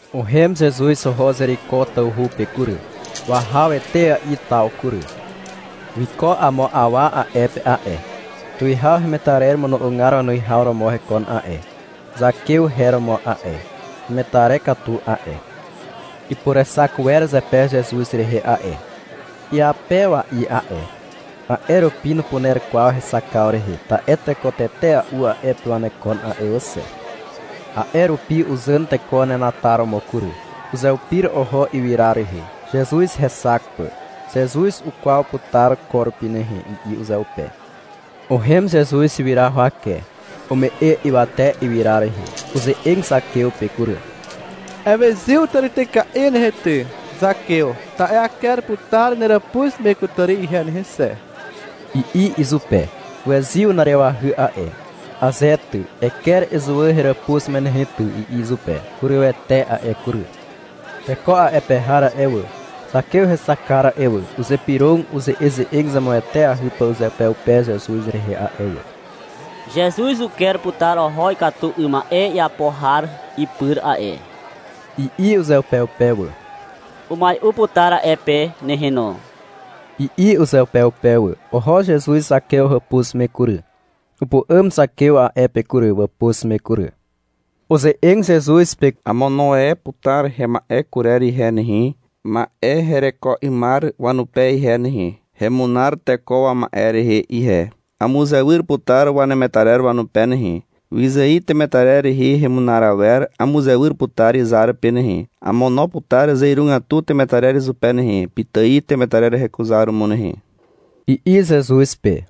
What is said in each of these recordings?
Uhem Zezuz oho Zeriko tawhu pe kury. Wahaw etea'i taw kury. Wiko amo awa a'e pe a'e. Tuwihaw hemetarer imono'ogar wanuwihaw romo hekon a'e. Zakew her romo a'e. Hemetarer katu a'e. Ipurexak wer zepe Zezuz rehe a'e. Iapewa'i a'e. A'e rupi nupuner kwaw hexakaw rehe, ta'e teko tetea'u a'e pe wanekon a'e wà xe. A'e rupi uzàn teko wanenataromo kury. Uzeupir oho ywyra rehe, Zezuz hexak pà. — Zezuz ukwaw putar ko rupi nehe, i'i uzeupe. Uhem Zezuz ywyra huwake. Ume'e ywate ywyra rehe. Uze'eg Zakew pe kury. — Ewezyw tàrityka'i nehe ty, Zakew, ta'e aker putar neràpuz me kutàri ihe nehe xe, i'i izupe. Uwezyw na'arewahy a'e. — Aze ty, eker ezuwà heràpuz me ty, i'i izupe. Hurywete a'e kury. Teko a'e pe har a'e wà, Zakew hexakar a'e wà, uzypyrog uze'eze'eg zemueteahy pà uzeupeupe Zezuz rehe a'e wà. — Zezuz uker putar oho ikatu 'ym ma'e iapo har ipyr a'e, i'i uzeupeupe wà. — Umai'u putar a'e pe nehe no, i'i uzeupeupe wà. Oho Zezuz Zakew hàpuz me kury. Upu'àm Zakew a'e pe kury, wàpuz me kury. Uze'eg Zezuz pe. — Amono e putar hema'e kurer ihe nehe, ma'e hereko 'ymar wanupe ihe nehe. Hemunar teko wama'e rehe ihe. Amuzewyr putar wanemetarer wanupe nehe. Wyzài temetarer rehe hemunar awer amuzewyr putar izar pe nehe. Amono putar zeirugatu temetarer izupe nehe, pitài temetarer hekuzaromo nehe, i'i Zezuz pe.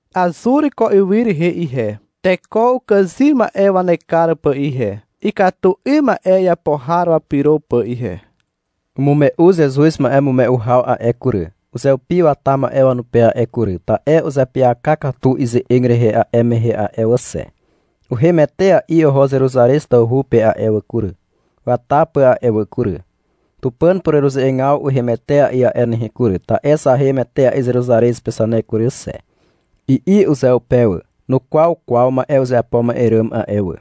Azur ko ywy rehe ihe, teko ukàzym ma'e wanekar pà ihe, ikatu 'ym ma'e iapo har wapyro pà ihe. Umume'u Zezuz ma'emume'u haw a'e kury, uzeupi wata ma'e wanupe a'e kury, ta'e uzeapyaka katu ize'eg rehe a'e mehe a'e wà xe. Uhem etea'i oho Zeruzarez tawhu pe a'e wà kury, wata pà a'e wà kury. — Tupàn pureruze'egaw uhem etea'i a'e nehe kury, ta'e zahem etea'i Zeruzarez pe zane kury xe, i'i uzeupe wà. Nukwaw kwaw ma'e uzeapo ma'e ràm a'e wà.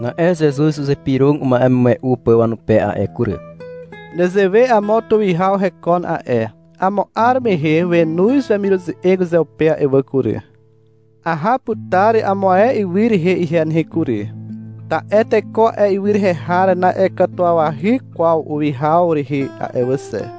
Na'e Zezuz uzypyrog uma'emume'u pà wanupe a'e kury. — Nezewe amo tuwihaw hekon a'e. Amo 'ar mehe wenoz wemiruze'eg uzeupe a'e wà kury. — Aha putar amo ae ywy rehe ihe nehe kury, ta'e teko a'e ywy rehe har na'iakatuwawahy kwaw uwihaw rehe a'e wà xe.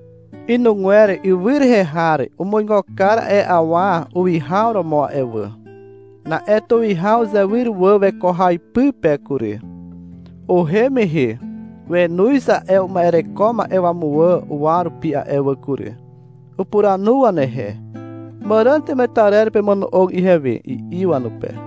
Inugwer ywy rehe har umuigo kar a'e awa uwihaw romo a'e wà. Na'e tuwihaw uzewyr wà weko haw ipy pe kury. Uhem mehe wenoz a'e uma'ereko ma'e wamuwà uwa rupi a'e wà kury. Upuranu wanehe. — Màràn temetarer pemono'og ihewe, i'i wanupe.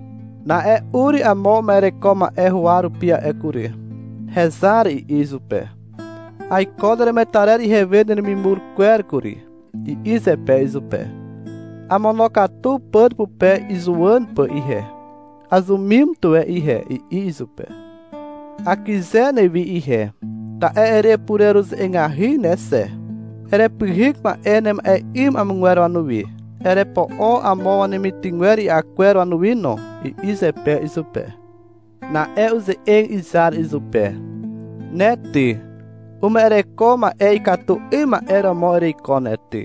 Na'e ur amo uma'ereko ma'e huwa rupi a'e kury. — Hezar, i'i izupe, — Aiko neremetarer ihewe neremimur kwer kury, i'i zepe izupe. — Amonokatu pàn pupe izuwàn pà ihe. Azumim tuwe ihe, i'i izupe. — Akyze newi ihe, ta'e erepureruze'egahy ne xe. Erepyhyk ma'e nema'e 'ym amogwer wanuwi. Erepo'o amo wanemitygwer i'a kwer wanuwi no, i'i zepe izupe. Na'e uze'eg izar izupe. — Ne ty, uma'ereko ma'e ikatu 'ym ma'e romo ereiko ne ty.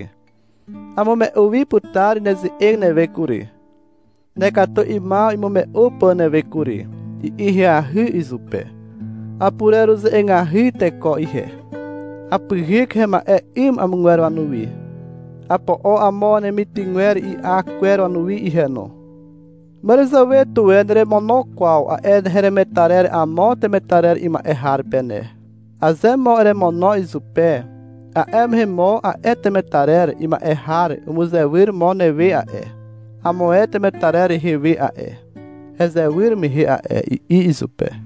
Amume'u wi putar neze'eg newe kury, nekatu 'ymaw imume'u pà newe kury, i'i ahyahy izupe. — Apureruze'egahy teko ihe. Apyhyk hema'e 'ym amogwer wanuwi. Apo'o amo wanemitygwer i'a kwer wanuwi ihe no. Màràzàwe tuwe neremono kwaw a'e heremetarer amo temetarer ima'e har pe ne. Aze mo eremono izupe, a'e mehe mo a'e temetarer ima'e har umuzewyr mo newe a'e, amo ae temetarer rehe we a'e, hezewyr mehe a'e, i'i izupe.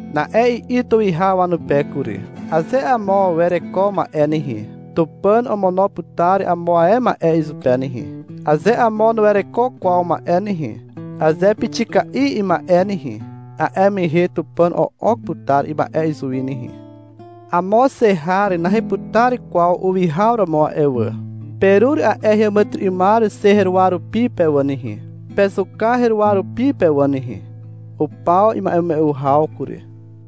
Na'e i'i tuwihaw wanupe kury. — Aze amo wereko ma'e nehe, Tupàn omono putar amo ae ma'e izupe nehe. Aze amo nuwereko kwaw ma'e nehe, aze pixika'i ima'e nehe, a'e mehe Tupàn o'ok putar ima'e izuwi nehe. Amo xe har naheputar kwaw uwihaw romo a'e wà. Perur a'e heàmàtyry'ymar xe heruwa rupi pe wà nehe, pezuka heruwa rupi pe wà nehe. Upaw ima'emume'u haw kury.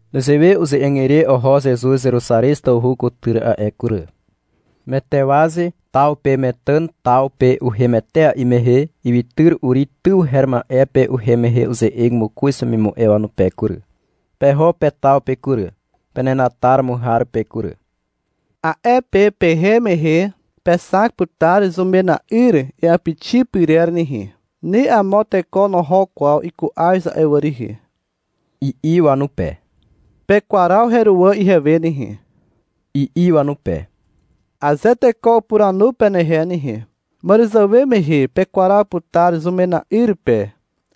Nezewe uze'eg ire oho Zezuz Zeruzarez tawhu kutyr a'e kury. Metewaze taw pe Metàn taw pe uhem etea'i mehe, ywytyr Uri tyw her ma'e pe uhem mehe uze'eg mokoz wemimu'e wanupe kury. — Peho pe taw pe kury, penenataromo har pe kury. A'e pe pehem mehe pexak putar zumena'yr iàpixi pyrer nehe. Ni amo teko noho kwaw iku'az a'e wà rihi, i'i wanupe. — Pekwaraw heruwà ihewe nehe, i'i wanupe. — Aze teko upuranu penehe nehe. — Màràzàwe mehe pekwaraw putar zumena'yr pe,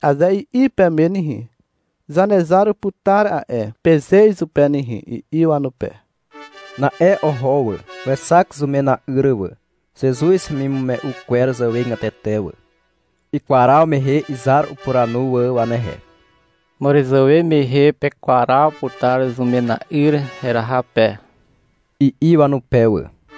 aze i'i peme nehe. — Zanezar uputar a'e, peze izupe nehe, i'i wanupe. Na'e oho wà. Wexak zumena'yr wà, Zezuz hemimume'u kwer zàwegatete wà. Ikwaraw mehe, izar upuranu wà wanehe. — Màràzàwe mehe pekwaraw putar zumena'yr heraha pe, i'i wanupe wà.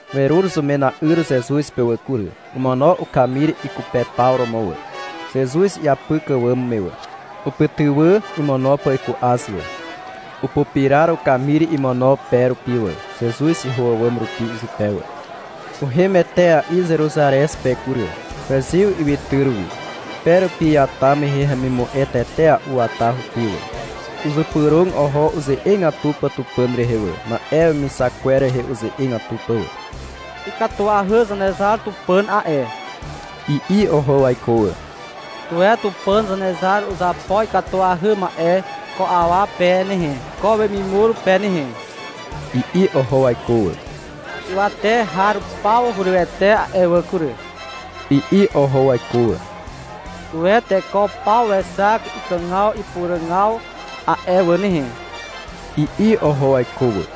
Werur zumena'yr Zezuz pe wà kury. Omono ukamir ikupepaw romo wà, Zezuz iapyk àwàm me wà. Upytywà imono pà iku'az wà. Upupirar ukamir imono pe rupi wà, Zezuz iho àwàm rupi izupe wà. Uhem etea'i Zeruzarez pe kury. Wezyw ywytyr wi. Pe rupi iata mehe hemimu'e tetea'u wata hupi wà. Uzypyrog oho uze'egatu pà Tupàn rehe wà, ma'e wemixak kwer rehe uze'egatu pà wà. — Ikatuahy Zanezar Tupàn a'e, i'i oho waiko wà. — Tuwe Tupàn Zanezar uzapo ikatuahy ma'e ko awa pe nehe, ko wemimur pe nehe, i'i oho waiko wà. — Ywate har paw hurywete a'e wà kury, i'i oho waiko wà. — Tuwe teko paw wexak ikàgaw ipuràgaw a'e wà nehe, i'i oho waiko wà.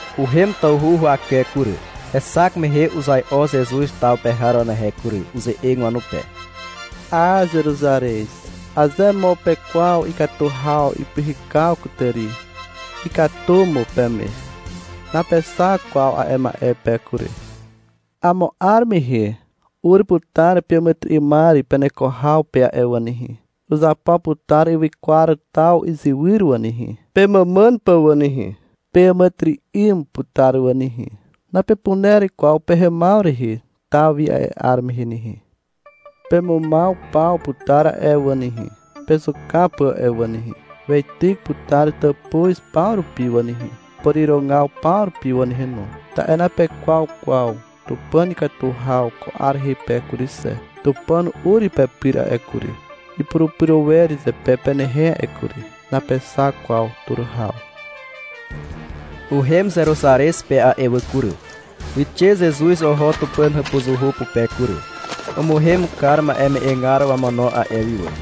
Uhem tawhu huwake kury. Hexak mehe uzai'o Zezuz taw pe har wanehe kury. Uze'eg wanupe. — A, Zeruzarez, aze mo pekwaw ikatu haw ipyhykaw kutàri, ikatu mo peme. Napexak kwaw a'e ma'e pe kury. — Amo 'ar mehe ur putar peàmàtyry'ymar peneko haw pe a'e wà nehe. Uzapo putar ywykwar taw izywyr wà nehe, pemàmàn pà wà nehe. Peàmàtyry'ym putar wà nehe. Napepuner kwaw pehemaw rehe taw wi a'e 'ar mehe nehe. Pemumaw paw putar a'e wà nehe, pezuka pà a'e wà nehe. Weityk putar tàpuz paw rupi wà nehe, pàrirogaw paw rupi wà nehe no, ta'e napekwaw kwaw Tupàn ikatu haw ko 'ar rehe pe kury xe. Tupàn ur pepyr a'e kury, ipurupyro wer zepe penehe a'e kury. Napexak kwaw tur haw. Uhem Zeruzarez pe a'e wà kury. Wixe Zezuz oho Tupàn hàpuzuhu pupe kury. Umuhem kar ma'eme'egar wamono a'e wi wà.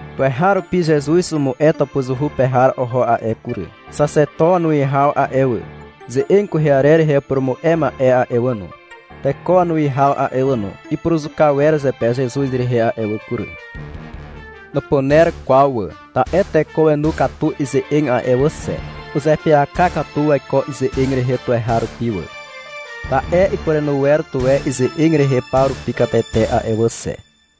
Tuweharupi Zezuz umu'e tàpuzuhu pe har oho a'e kury. Xaxeto wanuwihaw a'e wà, ze'eg kwehe arer rehe upurumu'e ma'e a'e wà no, teko wanuwihaw a'e wà no, ipuruzuka wer zepe Zezuz rehe a'e wà kury. Nupuner kwaw wà, ta'e teko wenu katu ize'eg a'e wà xe. Uzeapyaka katu waiko ize'eg rehe tuweharupi wà, ta'e ipurenu wer tuwe ize'eg rehe paw rupi katete a'e wà xe.